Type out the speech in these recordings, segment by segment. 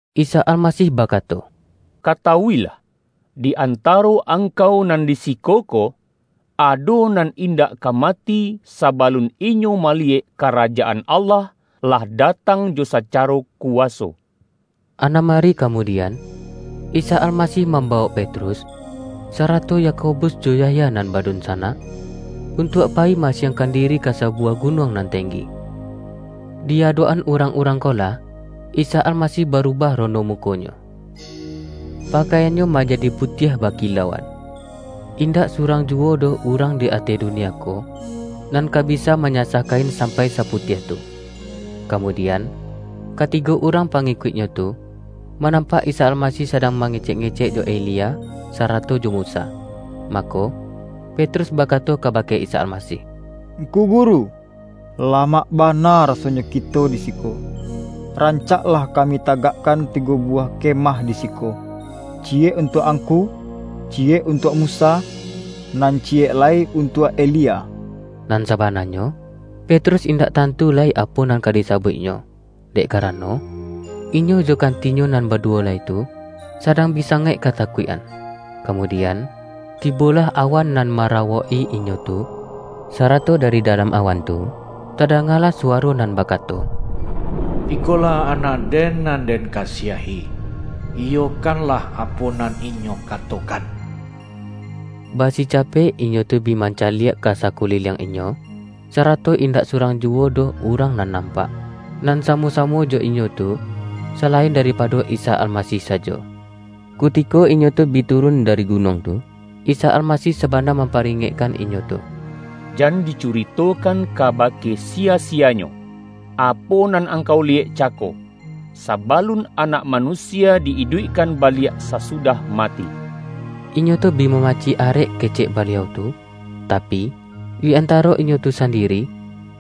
Isa Almasih bakato,”Katawuilah, di antaro angkau nan di siko ko, ado nan indak ka mati, sabalun inyo maliyek Karajaan Allah lah datang jo sacaro kuwaso!” Anam ari kamudian, Isa Almasih mambawok Petrus, sarato Yakobus jo Yahya nan badunsanak, untuak pa-yi ma-asiangkan diri ka sabuwah gu-nuang nan tenggi. Di adok-an urang-urang ko lah, Isa Almasih barubah rono muko-Nyo. pakaian-Nyo manja-di putiah bakilauan. Indak surang ju-wo doh urang di ateh dunia ko, nan ka bisa manyasah kain sampai saputiah tu. Kamudian, katigo urang pangi-kuik-Nyo tu, manampak Isa Almasih sadang mangecek-ngecek jo Elia, sa-rato jo Musa. Mako, Petrus bakato kabake Isa Almasih,”Ngku Guru, la-mak bana rasonyo kito di siko. Ran-cak lah kami tagakkan tigo buwah kemah di siko: ciyek untuak Angku, ciyek untuak Musa, nan ciyek lai un-tuak Elia.” Nan sabananyo, Petrus indak tantu lai apo nan ka disabuik-nyo, dek karano, inyo jo kantinyo nan baduwo lai tu, sadang bi sangaik ka-takuik-an. Kamudian, tibolah awan nan mara-wok-i inyo tu, sarato dari dalam awan tu, tadangalah suwaro nan bakato,”Ikolah Anak-Den, nan Den kasiahi. Iyokanlah apo nan Inyo katokan!” Ba-sicapek inyo tu bi mancaliak ka sa-kuliliang inyo, sarato indak surang juwo doh urang nan nampak, nan sa-mo-samo jo inyo tu, salain daripado Isa Almasih sajo. Kutiko inyo tu bi turun dari gunuang tu, Isa Almasih sabana mamparingekkan inyo tu,”Jan dicuritokan kabake siya-siyanyo, apo nan angkau liyek cako, sabalun Anak Manusia di-iduikkan baliak sasudah mati.” Inyo tu bi mamacik arek kecek Ba-liau tu, tapi, di antaro inyo tu sandiri,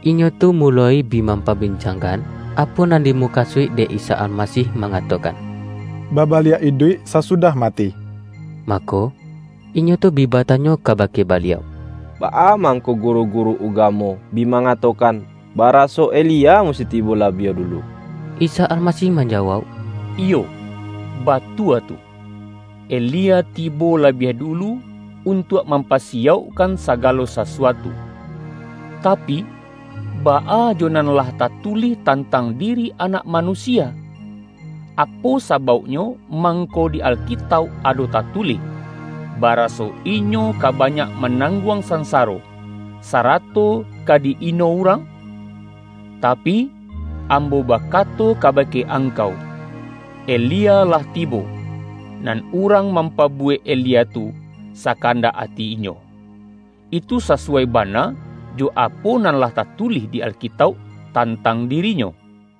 inyo tu muloi bi mampabincangkan, apo nan dimukasuik dek Isa Almasih mangatokan,”babaliak iduik sasudah mati”. Mako, inyo tu bi batanyo ka-bake Baliau,”Baa mangko guru-guru ugamo bi mangatokan, baraso Elia musti tibo labiah dulu?” Isa Almasih manjawauk,”Iyo, ba-tua tu, Elia tibo labiah dulu, untuak mampasiyaukkan sagalo sasuatu. Ta-pi, baa jo nan lah tatulih tantang diri Anak Manusia? Apo sabauknyo mang-ko di Alkitauk ado tatulih, baraso Inyo ka banyak manangguang sansaro, sa-rato ka di-ino urang? Tapi, Ambo bakato kabake angkau: Elia lah tibo, nan urang mampabuwek Elia tu, sa-kandak ati inyo. Itu sasuwai bana, jo apo nan lah tatulih di Alkitauk tan-tang dirinyo.”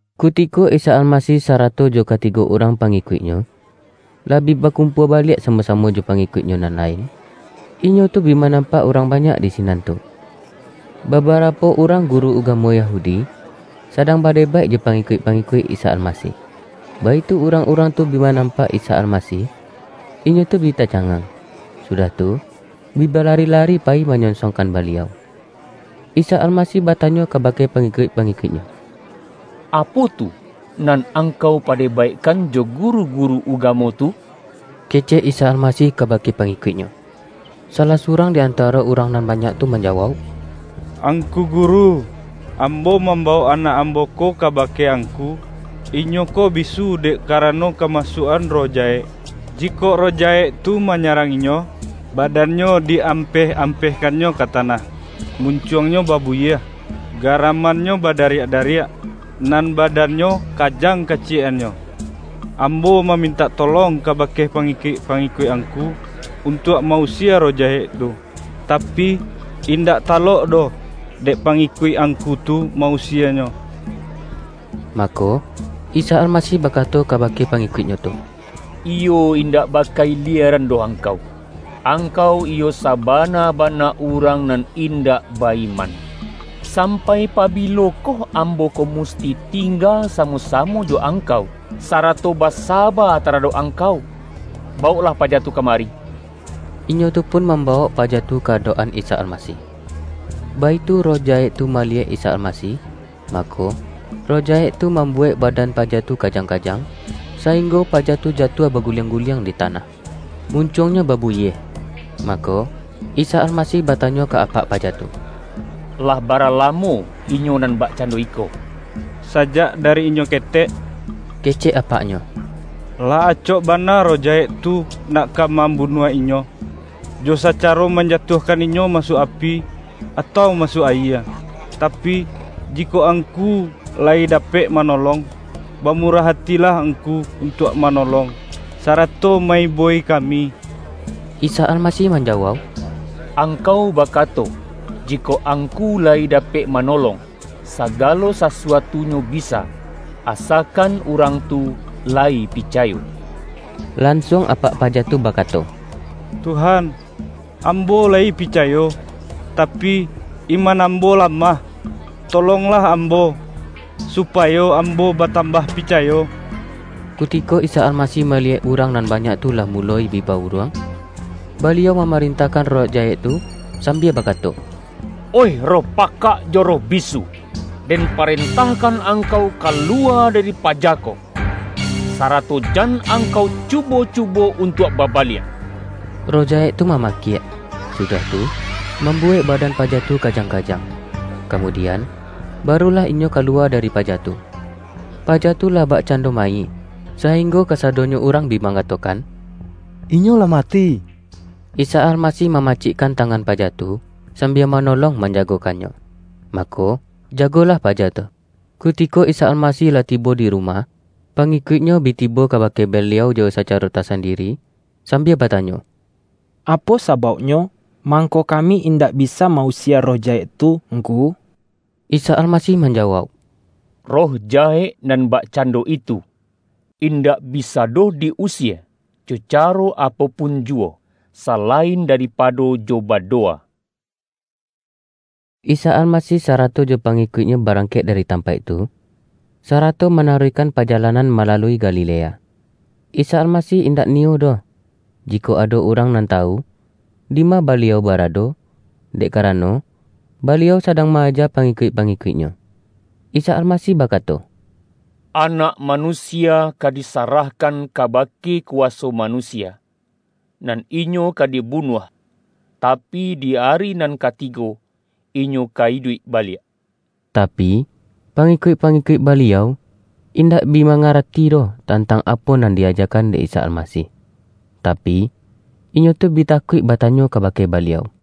Kutiko Isa Almasih sarato jo katigo urang pangikuik-Nyo, lah bi bakumpua baliak samo-samo jo pangikuik-Nyo nan lain, inyo tu bi manampak urang banyak di sinan tu. Babarapo urang guru ugamo Yahudi, sadang badebaik jo pangikuik-pangikuik Isa Almasih. Baitu urang-urang tu bi manampak Isa Almasih, inyo tu bi tacangang, su-dah tu, bi balari-lari payi manyonsong-kan Baliau. Isa Almasih batanyo ka-bake pangikuik-pangikuik-Nyo,”Apo tu nan angkau padebaikkan jo guru-guru ugamo tu?” kecek Isa Almasih kabake pangikuik-Nyo. Salah surang di antaro urang nan banyak tu manjawauk,”Angku Guru, ambo mambawok anak ambo ko ka-bake Angku. Inyo ko bisu dek karano kamasuak-an roh jahek. Jikok roh jahek tu manyarang inyo, badannyo di ampeh-ampehkannyo ka tanah, mun-cuangnyo babuyieh, garamannyo ba-dariak-dariak, nan badannyo kajang kaciyek-annyo. Ambo mamintak tolong kabake pangikuik-pangikuik Angku, untuak ma-usie roh jahek tu, tapi, indak talok doh dek pangikuik Angku tu ma-usienyo.” Mako, Isa Almasih bakato kaba-ke pangikuik-Nyo tu,”Iyo indak baka-ilieran doh angkau! Angkau iyo saba-na-bana urang nan indak ba-iman. Sampai pabilokoh Ambo ko musti ting-ga samo-samo jo angkau, sarato ba-saba taradok angkau? Bawoklah paja tu kamari!” Inyo tu pun mambawok paja tu ka adok-an Isa Almasih. Baitu roh jahek tu maliyek Isa Almasih, mako, roh jahek tu mambuwek ba-dan paja tu kajang-kajang, sainggo pa-ja tu jatuah baguliang-guliang di ta-nah. Muncuangnyo babuyieh. Mako, Isa Almasih batanyo ka apak paja tu,”Lah bara lamo inyo nan bakcando iko?””Sajak dari inyo ketek!” kecek apak-nyo. ”Lah acok bana roh jahek tu nak ka mambunuah inyo, jo sacaro manjatuahkan inyo masuak api, atau masuak ayie. Tapi, jikok Angku la-yi dapek manolong, bamurah atilah Angku untuak manolong, sarato ma-iboi kami!” Isa Almasih manjawauk,”Angkau bakato: Jikok Angku layi dapek ma-nolong. Sagalo sasuatunyo bisa, asa-kan urang tu layi picayo!” Lansuang apak paja tu bakato,”Tuhan, ambo layi picayo, tapi, iman ambo lamah. Tolonglah ambo, supa-yo ambo batambah picayo!” Kutiko Isa Almasih maliyek urang nan banyak tu lah muloi bi ba-uruang, Baliau mamarentahkan roh jahek tu, sambia bakato,”Oih roh pakak jo roh bisu, Den parentahkan angkau kalu-wa dari paja ko, sarato jan angkau cu-bo-cubo untuak babaliak!” Roh jahek tu mamakiak, sudah tu, mambuwek badan paja tu kajang-kajang, kamudian, barulah inyo kalu-wa dari paja tu. Paja tu lah bakcan-do mayik, sainggo kasadonyo urang bi mangatokan,”Inyo lah mati!” Isa Almasih mamacikkan tangan paja tu, sambia manolong manjagokannyo. Ma-ko, jagolah paja tu. Kutiko Isa Almasih lah tibo di ru-mah, pangikuik-Nyo bi tibo kabake Baliau jo sacaro tasandiri, sambia ba-tanyo,”Apo sabauknyo, mangko ka-mi indak bisa ma-usie roh jahek tu Ngku?” Isa Almasih manjawauk,”Roh ja-hek nan bakcando itu, indak bisa doh di-usie jo caro apo pun juwo, salain daripado jo badowa.” Isa Almasih sarato jo pangikuik-Nyo barangkek dari tampaik tu, sarato manaruihkan pajalanan malalui Ga-lilea. Isa Almasih indak niyo doh, ji-kok ado urang nan tawu, dima Baliau barado, dek karano, Baliau sadang ma-aja pangikuik-pangikuik-Nyo. Isa Almasih bakato,”Anak Manusia ka disarahkan kabake kuwaso manusia, nan Inyo ka dibunuah, tapi, di ari nan katigo Inyo ka iduik baliak!” Tapi, pangikuik-pangikuik Baliau, indak bi mangarati doh tantang apo nan di-ajakan dek Isa Almasih, tapi, inyo tu bi takuik batanyo kabake Ba-liau.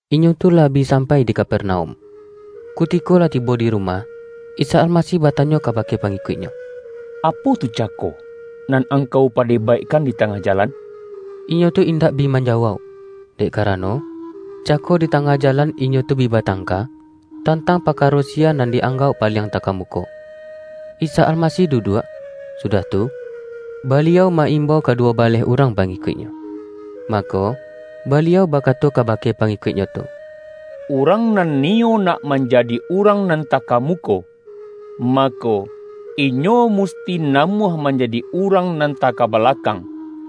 Inyo tu lah bi sampai di Kaper-naum. Kutiko lah tibo di rumah, Isa Almasih batanyo kabake pangikuik-Nyo,”Apo tu cako nan angkau pade-baikkan di tangah jalan?” Inyo tu indak bi manjawauk, dek karano, cako di tangah jalan inyo tu bi batangka, tantang parkaro siya nan di-anggauk paliang takamuko. Isa Almasih duduak, sudah tu, Baliau ma-imbau kaduwo baleh urang pangikuik-Nyo. Mako, Baliau bakato kabake pa-ngikuik-Nyo tu,”Urang nan niyo nak manjadi urang nan takamuko, mako, inyo musti namuah manjadi urang nan takabalakang,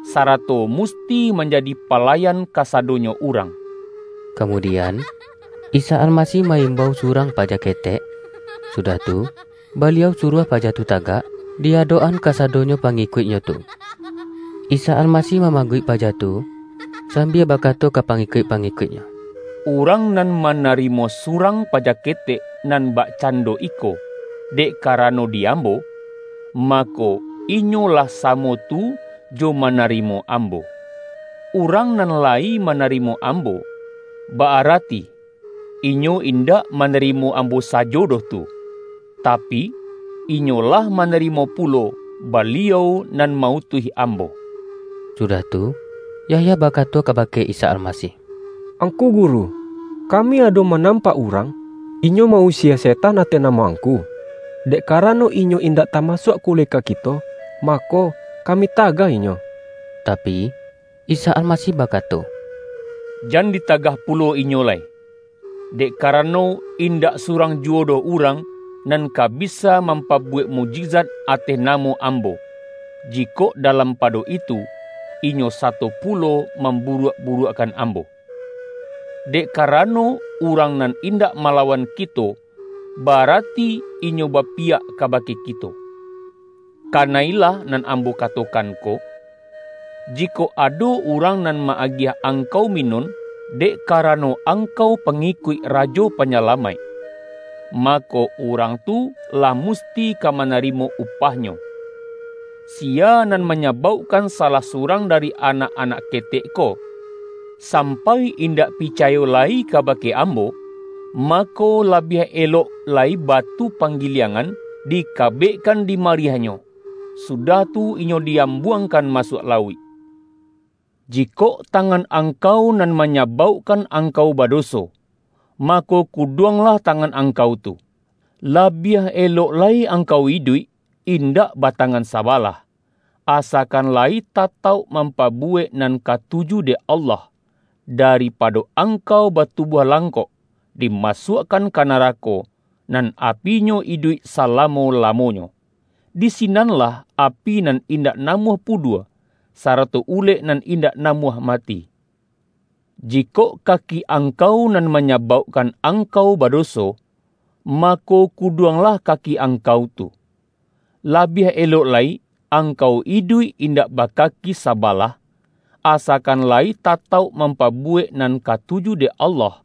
sarato musti manjadi pa-layan kasadonyo urang.” Kamudi-an, Isa Almasih ma-imbau surang pa-ja ketek, sudah tu Baliau suruah paja tu tagak, di adok-an kasadonyo pangi-kuik-Nyo tu. Isa Almasih mamaguik paja tu, sambia bakato ka pangikuik-pangikuik-Nyo, ”Urang nan mana-rimo surang paja ketek nan bakcan-do iko, dek karano di Ambo, mako, inyo lah samo tu jo manarimo Ambo. Urang nan layi manarimo Ambo, ba-arati inyo indak manarimo Ambo sajo doh tu, tapi, inyo lah manarimo pulo, Baliau nan ma-utuih Ambo.” Sudah tu, Yahya bakato kabake Isa Almasih,”Ngku Guru, kami ado manam-pak urang, inyo ma-usie setan ateh namo Angku. Dek karano inyo indak tamasuak kuleka kito, mako, kami tagah inyo.” Tapi, Isa Almasih bakato,”Jan dita-gah pulo inyo lai, dek karano, indak su-rang juwo doh urang, nan ka bisa mam-pabuwek mukjizat ateh namo Ambo, jikok dalam pado itu, inyo sato pulo mamburuak-buruakkan Ambo. Dek karano, urang nan indak malawan ki-to, ba-arati inyo bapiyak kabake kito. Kana-ilah nan Ambo katokan ko! Ji-kok ado urang nan ma-agiah angkau mi-nun, dek karano angkau pangikuik Rajo Panyalamaik, mako, urang tu lah musti ka manarimo upahnyo.” ”Siya nan manyabaukkan salah su-rang dari anak-anak ketek ko, sampai indak picayo lai kabake Ambo, mako, labiah elok lai batu panggiliangan, di-kabekkan di mariahnyo, sudah tu inyo di-ambuangkan masuak lauik. Jikok tangan angkau nan manyabaukkan ang-kau badoso, mako, kuduanglah tangan angkau tu! Labiah elok lai angkau iduik indak batangan sabalah, asakan layi tatauk mampabuwek nan katuju dek Allah, daripado angkau batubuah lang-kok, dimasuakkan ka narako, nan api-nyo iduik salamo-lamonyo. Di sinan-lah api nan indak namuah pudua, sarato ulek nan indak namuah mati.] Jikok kaki angkau nan manyabaukkan angkau badoso, mako, kuduanglah kaki ang-kau tu. Labiah elok lai angkau iduik in-dak bakaki sabalah, asakan layi tatauk mampabuwek nan katuju dek Allah,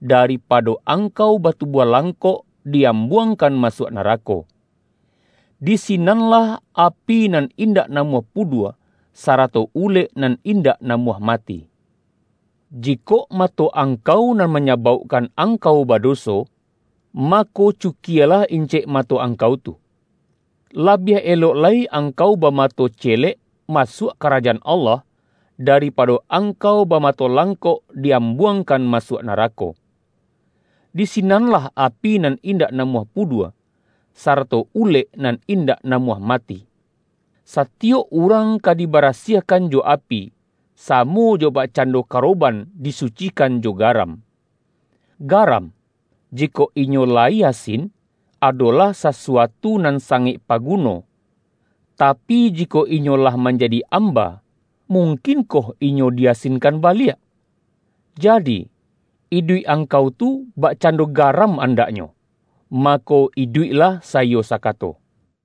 da-ripado angkau batubuah langkok di-am-buangkan masuak narako. Di sinan-lah api nan indak namuah pudua, sarato ulek nan indak namuah mati.] Jikok mato angkau nan manyabaukkan ang-kau badoso, mako, cukialah incek mato angkau tu! Labiah elok lai angkau bama-to celek masuak Karajaan Allah, daripa-do angkau bamato langkok di-ambuang-kan masuak narako. Di sinanlah api nan indak namuah pudua, sarato ulek nan indak namuah mati. Satiyok urang ka dibarasiahkan jo api, samo jo bakcando karoban di-sucikan jo garam. Garam, jikok inyo layi asin, ado-lah sasuatu nan sangaik paguno, tapi, jikok inyo lah manjadi amba, mungkin-koh inyo di-asinkan baliak? Jadi, iduik angkau tu bakcando garam andaknyo -- mako, iduiklah saiyo sakato.”